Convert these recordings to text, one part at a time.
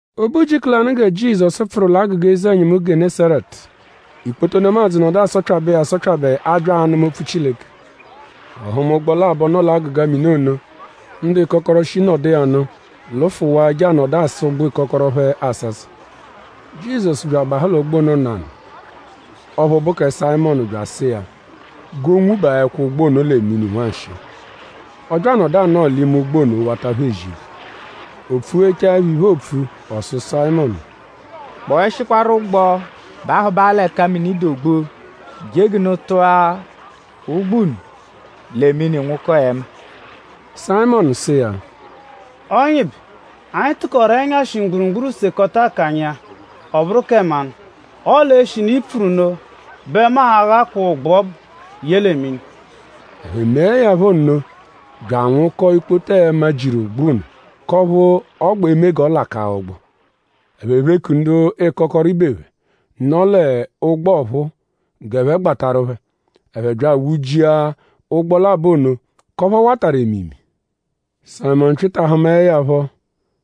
O be ujiku lanụ gẹ Jizọsu pfụru l'agụga eze-ẹnyimu Gẹnesaretu; ikpoto nemadzụ nọdu asọpyabe iya asọpyabe abya anụma opfu Chileke. Ọ hụma ụgbo labọ, nọ l'agụga mini ono. Ndu ịkokoro, shi nọdu l'ụgbo ono lụfuwaa je anọdu asa ụgbu ịkokoro phẹ asasa. Jizọsu bya abahụ l'ụgbo ono nanụ; ọphu bụ kẹ Sayịmonu bya asụ iya g'o nwubaẹkwa ụgbo ono lẹ mini nwanshịi. Ọ bya anọdu anọo l'ime ụgbo ono; wata phẹ ezi iphe. O pfughechaẹpho iphe, oopfu; ọ sụ Sayịmonu: “Kpọeshikwaru ụgbo bahụbaa l'ẹka mini dụ ogbu; je g'unu tụa ụgbu unu lẹ mini nwụkoo ẹma.” Sayịmonu sụ iya: “Ọnyibe; anyi tụkoru ẹnyashi mgburugburu sekọta akanya iya; ọ bụru kẹ mmanụ. Ọle eshinu i pfuru nno bẹ mu a-ghakwaa ụgbu ọbu ye lẹ mini.” Ẹphe meẹ ya phọ nno bya anwụkoo ikpoto ẹma, jiru ụgbu ono; k'ọphu ọ gbẹ eme g'ọ lakaa ụgbu. Ẹphe pheku ndu ịkokoro ibe phẹ, nọ l'ụgbo ọphuu g'ẹphe gbatarụ phẹ. Ẹphe bya anwụ-jia ụgbo labọ ono; k'ọphu ọ watarụ emimi. Sayịmonu Pyịta hụmae ya phọ;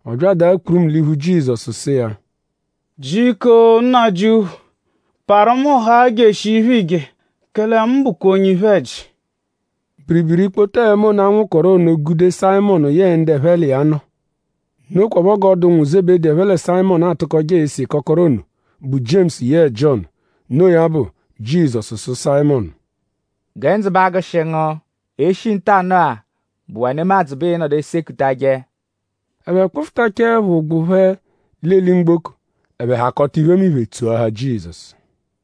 ọ bya adaa kpurumu l'iphu Jizọsu sụ iya: “Jiko Nnajịuphu! Parụ mu haa jeshia iphe, iije; kẹle mu bụkwa onye iphe-ẹji.” Biribiri ikpoto ẹma ono, a nwụkoru ono gude Sayịmonu yẹe ndu ẹphe l'iya nọ. Nokwaphọ g'ọ dụ ụnwu Zebedi, ẹphe lẹ Sayịmonu atụkoje ese ịkokoro ono, bụ Jiemusu yẹe Jiọnu. Noo ya bụ; Jizọsu sụ Sayịmonu: “Gẹ ndzụ ba agụshi ngu. E -shi ntanụ-a bụwaa nemadzụ bẹ ịi-nọdu esekutajẹ.” Ẹphe kpụfutachaepho ụgbo phẹ l'eli-mgboko; ẹphe hakọta iphemiphe tsoahaa Jizọsu.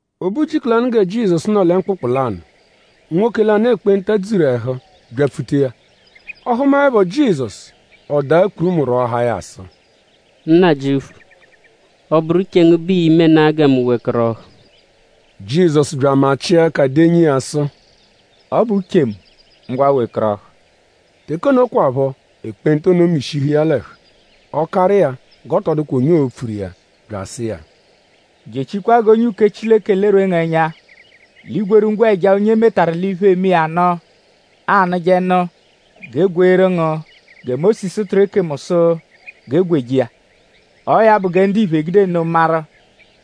O be ujiku lanụ gẹ Jizọsu nọ lẹ mkpụkpu lanụ; nwoke lanụ, ekpenta dzuru ẹhu byapfuta iya. Ọ hụmaepho Jizọsu; ọ daa kpurumu rwọahaa ya sụ: “Nnajịuphu; ọ -bụru uche ngu bẹ ii-menaa gẹ mu wekọrohu.” Jizọsu bya amachịa ẹka denyi iya sụ: “Ọ bụ uche mu. Ngwa wekọrohu!” Teke ono kwaphọ ekpenta ono mishihu iya l'ẹhu. Ọ karụ iya g'ọ tọ dụkwa onye oo-pfuru iya bya asụ iya: “Jechikwa g'onye uke Chileke lerwee ngu ẹnya; l'i gwerụ ngwẹja, onye e metaru l'iphe, eme iya nụ anụje nụ g'e gweeru ngu gẹ Mósisu tụru ekemu sụ g'e gweje iya. Ọo ya bụ gẹ ndiphe egude nno maru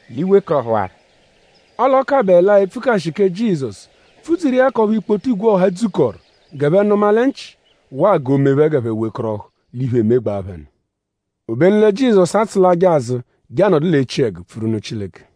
l'i wekọrohuwaru.” Ọle a kabaẹlaa epfukashi kẹ Jizọsu pfudzuru iya k'ọphu ikpoto igwe ọha dzukọru g'ẹphe nụma lẹ nchị; waa g'o mee phẹ g'ẹphe wekọrohu l'iphe, emegbaa phẹ nụ. Obenu lẹ Jizọsu atsụlaje azụ je anọdu l'echiẹgu pfuru nụ Chileke.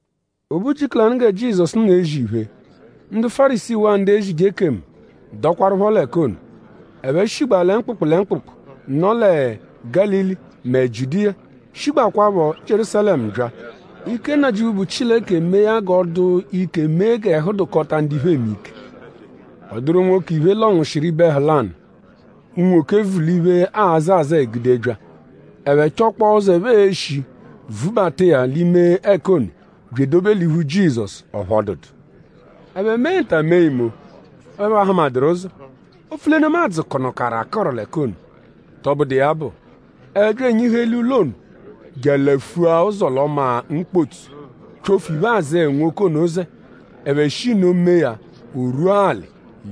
O be ujiku lanụ gẹ Jizọsu nọ ezi iphe; ndu Fárisii waa ndu ezije ekemu dọkwarupho l'ẹka ono. Ẹphe shigbaa lẹ mkpụkpu lẹ mkpụkpu, nọ lẹ Gálili mẹ Jiudiya; shigbakwaphọ Jierúsalẹmu bya. Ike Nnajịuphu, bụ Chileke mee ya g'ọ dụ ike mee g'ẹhu dụkota ndu iphe eme ike. Ọ dụru nwoke, iphe lọnwushiru ibe ẹhu lanụ, unwoke vu l'iphe, aazẹ azẹe gude bya. Ẹphe chọkpoo ụzo, ẹphe e-shi vubata iya l'ime ẹka ono bya edobe l'iphu Jizọsu; ọphu ọ dụdu. Ẹphe mee nta mee imo; ọphu ẹphe ahụmaduru ụzo; opfu lẹ nemadzụ kụnukaru akụru l'ẹka ono. Tọbudu iya bụ; ẹphe bya enyihu eli ụlo ono; je alafua ụzo l'ọma mkpotsu; pyofu iphe-azẹe, nwoke ono zẹ. Ẹphe shi nno mee ya o rwua alị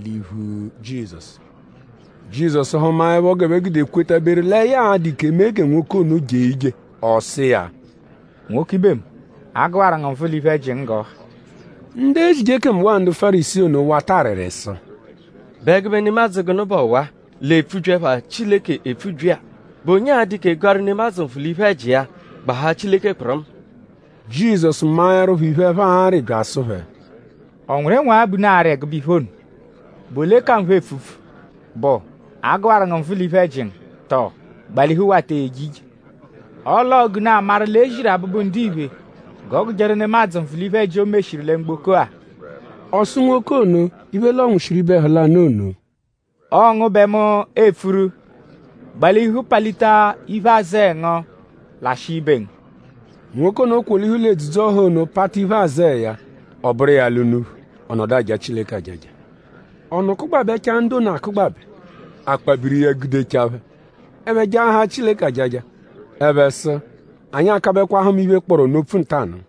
l'iphu Jizọsu. Jizọsu hụmaepho g'ẹphe gude kwetaberu lẹ ya a-dụ ike mee gẹ nwoke ono jee ije; ọ sụ iya: “Nwoke ibe mu; a gụwaru ngu nvụ l'iphe-ẹji ngu g'ọ ha.” Ndu ezije ekemu waa ndu Fárisii ono wata arịri sụ: “?Bụ ẹgube nemadzụ gụnu bụ ọwa-a, l'epfubyi ẹpha Chileke epfubyi-a??Bụ onye a-dụ ike gụaru nemadzụ nvụ l'iphe-ẹji iya; gbahaa Chileke kpụrumu?” Jizọsu maẹrupho iphe, ẹphe arị bya asụ phẹ:?Ọ nwụru ịnwagha bẹ unu arị ẹgube iphe ono? ?Bụ ole ka nphe epfupfu??Bụ: A gụwaru ngu nvụ l'iphe-ẹji ngu??Tọo: Gbalihu wata eje ije? Ọle ọo g'unu a-maru l'e ziru Abụbu-Ndiphe g'ọ gụjeru nemadzụ nvụ l'iphe-ẹji, o meshiru lẹ mgboko-a. Ọ sụ nwoke ono, iphe lọnwushiru ibe ẹhu lanụ ono: Ọo ngu bẹ mu epfuru; gbalihu palita iphe-azẹe ngu; lashịa ibe ngu. Nwoke ono kwolihu l'edzudzu-ọha ono pata iphe-azẹe ya; ọ bụru iya ala unuphu. Ọ nọdu aja Chileke ajaja. Ọnu kụgbabechaa ndu ono akụgbabe. Akpabiri iya gudechaa phẹ. Ẹphe jaahaa Chileke ajaja. Ẹphe sụ: Anyi akabẹkwa hụma iphe, kpọru ọnu opfu ntanụ.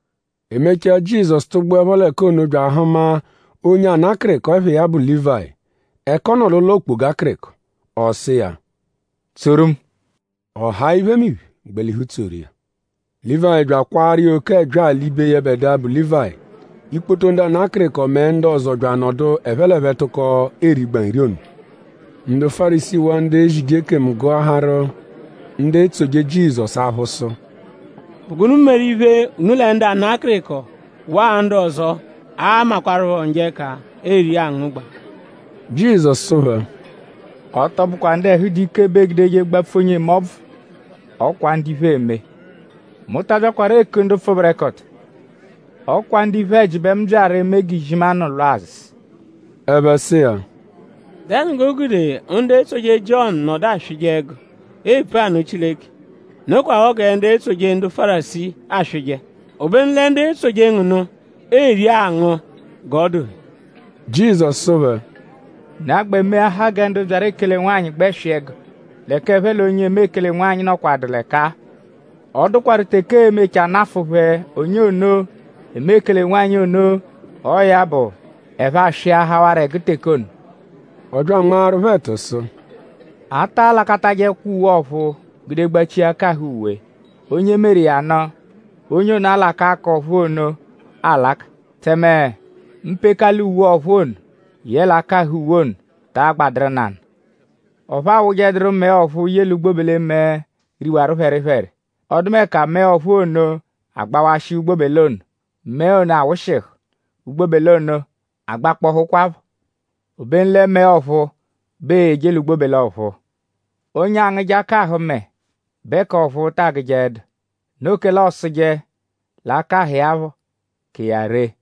E mechaa; Jizọsu tụgbuepho l'ẹka ono bya ahụma onye ana akịriko, ẹpha iya bụ Lívayi; ẹka ọ nọ l'ụlo okpoga akịriko. Ọ sụ iya: “Tsoru mu.” Ọ haa iphemiphe; gbalihu tsoru iya. Lívayi bya akwaaru iya oke ẹbyaa l'ibe yẹbedua, bụ Lívayi. Ikpoto ndu ana akịriko mẹ ndu ọzo bya anọdu ẹphe l'ẹphe tụko erigba nri ono. Ndu Fárisii waa ndu ezije ekemu gụaharu ndu etsoje Jizọsu aphụ sụ: “?Bụ gụnu meru iphe, unu lẹ ndu ana akịriko waa ndu ọzo, aamakwarụpho njọ ẹka eri angụgba?” Jizọsu sụ phẹ: “Ọ tọ bụkwa ndu ẹhu dụ ike bẹ eegudeje gbapfu onye eme ọbvu; ọ kwa ndu iphe eme. Mu ta abyakwaru eku ndu pfụberekoto; ọ kwa ndu iphe-ẹji bẹ mu byaru eme g'izimanụ lwa azụ.” Ẹphe sụ iya: “?Dẹnu g'o gude ndu etsoje Jiọnu nọdu aswịje ẹgu epfu anụ Chileke; nokwaphọ gẹ ndu etsoje ndu Fárisii aswịje; obenu lẹ ndu etsoje ngu nụ eri angụ g'ọ dụ phẹ?” Jizọsu sụ phẹ: “?Unu a-gbẹ meahaa gẹ ndu byaru ekele-nwanyị gbẹ swị ẹgu; l'ẹka ẹphe l'onye eme ekele-nwanyị nọkwadu l'ẹka-a? Ọ dụkwaru teke ee-mechaa nafụ phẹ onye ono, eme ekele-nwanyị ono. Ọo ya bụ; ẹphe aswịahawaro ẹgu teke ono.” Ọ bya anmaaru phẹ ẹtu sụ: “A ta alakatajẹkwa uwe ọ̀phúú gude gbachia akahụ uwe. Onye meru iya nụ; onye ono alakaa k'ọ̀phúú ono alaka; tẹme mpekala uwe ọ̀phúú ono yẹle akahụ uwe ono taa gbadụru nanụ. Ọphu a wụjeduru mẹe ọ̀phúú ye l'ugbobele-mẹe, riwaru phẹripheri. Ọdumeka mẹe ọ̀phúú ono agbawashịa ugbobele ono; mẹe ono awụshihu; ugbobele ono agbakpọhukwapho. Obenu lẹ mẹe ọ̀phúú bẹ eeyeje l'ugbobele ọ̀phúú. Onye angụje akahụ mẹe bẹ k'ọ̀phúú ta agụjeedu. Noo kẹle ọosuje l'akahụ iya phọ ka iya ree.”